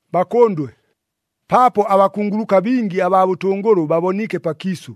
Bakʉndwe, paapo abakunguluka bingi abaa bʉtʉngʉlʉ baboniike pakiisʉ,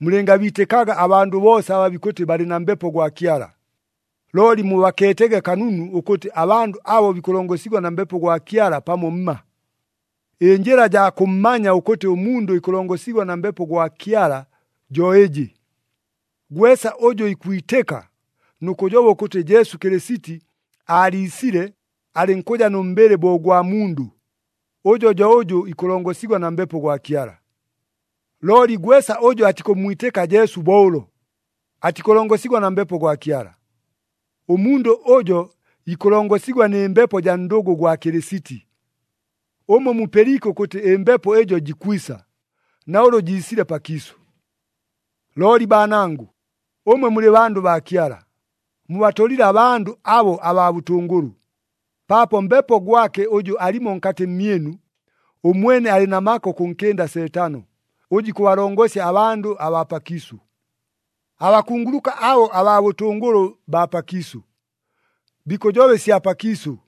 mulɨngabiitɨkaga abandʉ boosa aba bikʉtɨ balɨ na Mbepo gwa Kyala, looli mubakeetege kanunu ʉkʉtɨ abandʉ abo bikʉlongosigwa na Mbepo gwa Kyala pamo mma. Ɨnjɨla jaa kʉmmanya ʉkʉtɨ ʉmundʉ ikʉlongosigwa na Mbepo gwa Kyala jo ɨjɨ. Gwesa ʉjʉ ikwitɨka nʉ kʉjoba ʉkʉtɨ Jesu Kɨlɨsiti aaliisile alɨnkʉja nʉ mbɨlɨ bo ʉgwa mundʉ, ʉjo jo ʉjʉ ikʉlongosigwa na Mbepo gwa Kyala. Looli gwesa ʉjʉ atikʉmmwitɨka Jesu bo ʉlo, atikʉlongosigwa na Mbepo gwa Kyala. Ʉmundʉ ʉjo ikʉlongosigwa nɨ mbepo jaa ndʉgʉ gwa Kɨlɨsiti. Ʉmwe mupɨliike ʉkʉtɨ ɨmbepo ɨjo jikwisa, na ʉlʉ jiisile pakiisʉ. Looli baanangʉ, ʉmwe mulɨ bandʉ baa Kyala, mubatolile abandʉ abo abaa bʉtʉngʉlʉ, paapo Mbepo gwake ʉjʉ alimo nkatɨ mmyɨnu, ʉmwene alɨ na maka ʉkʉnkɨnda Seetano, ʉjʉ ikʉbalongosya abandʉ abaa pakiisʉ. Abakunguluka abo abaa bʉtʉngʉlʉ baa pakiisʉ, bikʉjoba ɨsya pakiisʉ.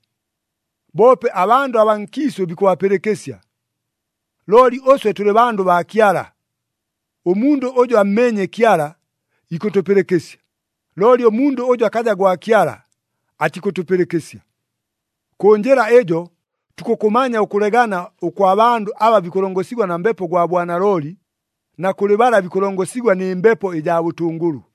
Boope abandʉ abaa nkiisʉ bikʉbapɨlɨkɨsya. Looli ʉswe tʉlɨ bandʉ baa Kyala. Ʉmundʉ ʉjʉ ammeenye Kyala, ikʉtʉpɨlɨkɨsya, looli ʉmundʉ ʉjʉ akaja gwa Kyala, atikʉtʉpɨlɨkɨsya. Kʉ njɨla ɨjo tukʉkʉmanya ʉkʉlegana ʉkwa bandʉ aba bikʉlongosigwa na Mbepo gwa bwanalooli, na kʉlɨ bala bikʉlongosigwa nɨ mbepo ɨjaa bʉtʉngʉlʉ.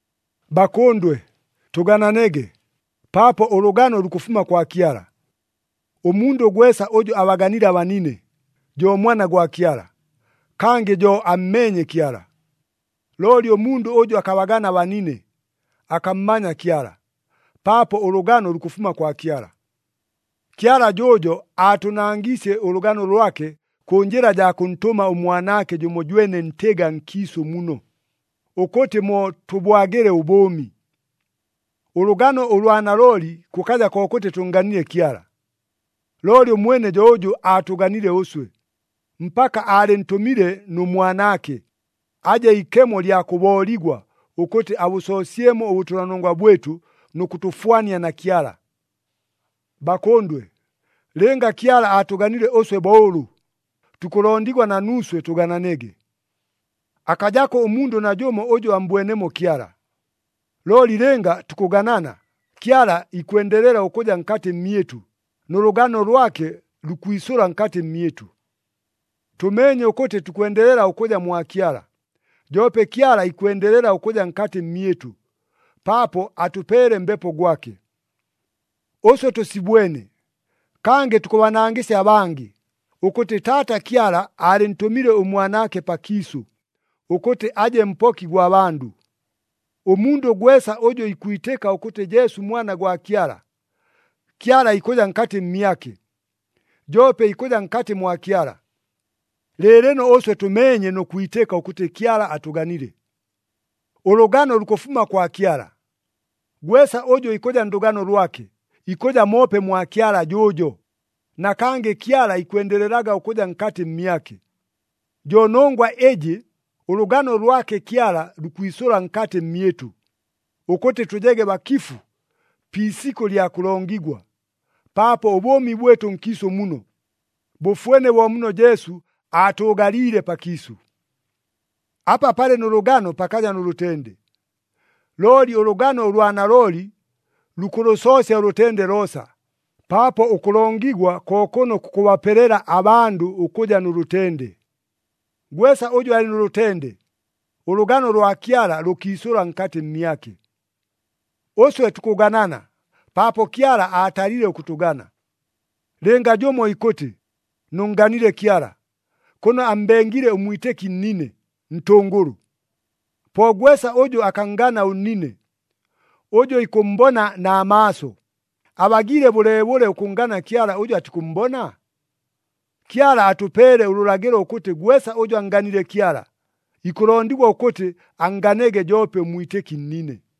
Bakʉndwe, tʉgananege, paapo ʉlʉgano lukʉfuma kwa Kyala. Ʉmundʉ gwesa ʉjʉ abaganile abanine, jo mwana gwa Kyala, kangɨ jo ammeenye Kyala. Looli ʉmundʉ ʉjʉ akabagana abanine, akammanya Kyala, paapo ʉlʉgano lukʉfuma kwa Kyala. Kyala jʉʉjo aatʉnangiisye ʉlʉgano lwake kʉ njɨla jaa kʉntʉma ʉMwanaake jʉmojwene ntɨga nkiisʉ muno, ʉkʉtɨ mo tʉbwagile ʉbʉʉmi. Ʉlʉgano ʉlwa nalooli kʉkaja kokʉtɨ tʉnnganile Kyala! Looli ʉmwene jo ʉjʉ aatʉganile ʉswe, mpaka aalɨntʉmile nʉ Mwanaake, aje ikemo lya kʉbooligwa ʉkʉtɨ abʉsoosyemo ʉbʉtʉlanongwa bwɨtʉ nʉ kʉtʉfwania na Kyala. Bakʉndwe, lɨnga Kyala aatʉganile ʉswe bo ʉlʉ, tukʉlondigwa na nuuswe tʉgananege. Akajako ʉmundʉ najʉmo ʉjʉ ammbwenemo Kyala. Looli lɨnga tukʉganana, Kyala ikwendelela ʉkʉja nkatɨ mmyɨtʉ, nʉ lʉgano lwake lukwisʉla nkatɨ mmyɨtʉ. Tʉmeenye ʉkʉtɨ tukwendelela ʉkʉja mwa Kyala, joope Kyala ikwendelela ʉkʉja nkatɨ mmyɨtʉ, paapo atʉpeele Mbepo gwake. Ʉswe tʉsibwene, kangɨ tukʉbanangɨsya abangɨ, ʉkʉtɨ Taata Kyala aalɨntʉmile ʉMwanaake pakiisʉ, ʉkʉtɨ aje Mpoki gwa bandʉ. Ʉmundʉ gwesa ʉjʉ ikwitɨka ʉkʉtɨ Jesu Mwana gwa Kyala, Kyala ikʉja nkatɨ mmyake, joope ikʉja nkatɨ mwa Kyala. Lɨɨlɨno ʉswe tʉmeenye nʉ kwitɨka ʉkʉtɨ Kyala atʉganile. Ʉlʉgano lukʉfuma kwa Kyala. Gwesa ʉjʉ ikʉja ndʉgano lwake, ikʉja moope mwa Kyala jʉʉjo, na kangɨ Kyala ikwendelelaga ʉkʉja nkatɨ mmyake. Jo nongwa ɨjɨ, ʉlʉgano lwake Kyala lukwisʉla nkatɨ mmyɨtʉ, ʉkʉtɨ tʉjege bakifu pi isikʉ lya kʉlongigwa, paapo ʉbʉʉmi bwɨtʉ nkiisʉ muno, bʉfwene bo muno Jesu aatʉʉgaliile pakiisʉ. Apa palɨ nʉ lʉgano pakaja nʉ lʉtende, looli ʉlʉgano ʉlwa nalooli lukʉlʉsoosya ʉlʉtende loosa, paapo ʉkʉlongigwa ko kʉno kukʉbapelela abandʉ ʉkʉja nʉ lʉtende. Gwesa ʉjʉ alɨ nʉ lʉtende, ʉlʉgano lwa Kyala lʉkiisʉla nkatɨ mmyake. Ʉswe tukʉganana, paapo Kyala aatalile ʉkʉtʉgana. Lɨnga jʉmo ikʉtɨ, “Nʉnnganile Kyala,” kʉno ammbengile ʉmwitɨki nnine, ntʉngʉlʉ. Po gwesa ʉjʉ akanngana ʉnnine, ʉjʉ ikʉmmbona na maaso, abagiile bʉleebʉle ʉkʉnngana Kyala ʉjʉ atikʉmmbona? Kyala atʉpeele ʉlʉlagɨlo ʉkʉtɨ gwesa ʉjʉ annganile Kyala, ikʉlondigwa ʉkʉtɨ annganege joope ʉmwitɨki nnine.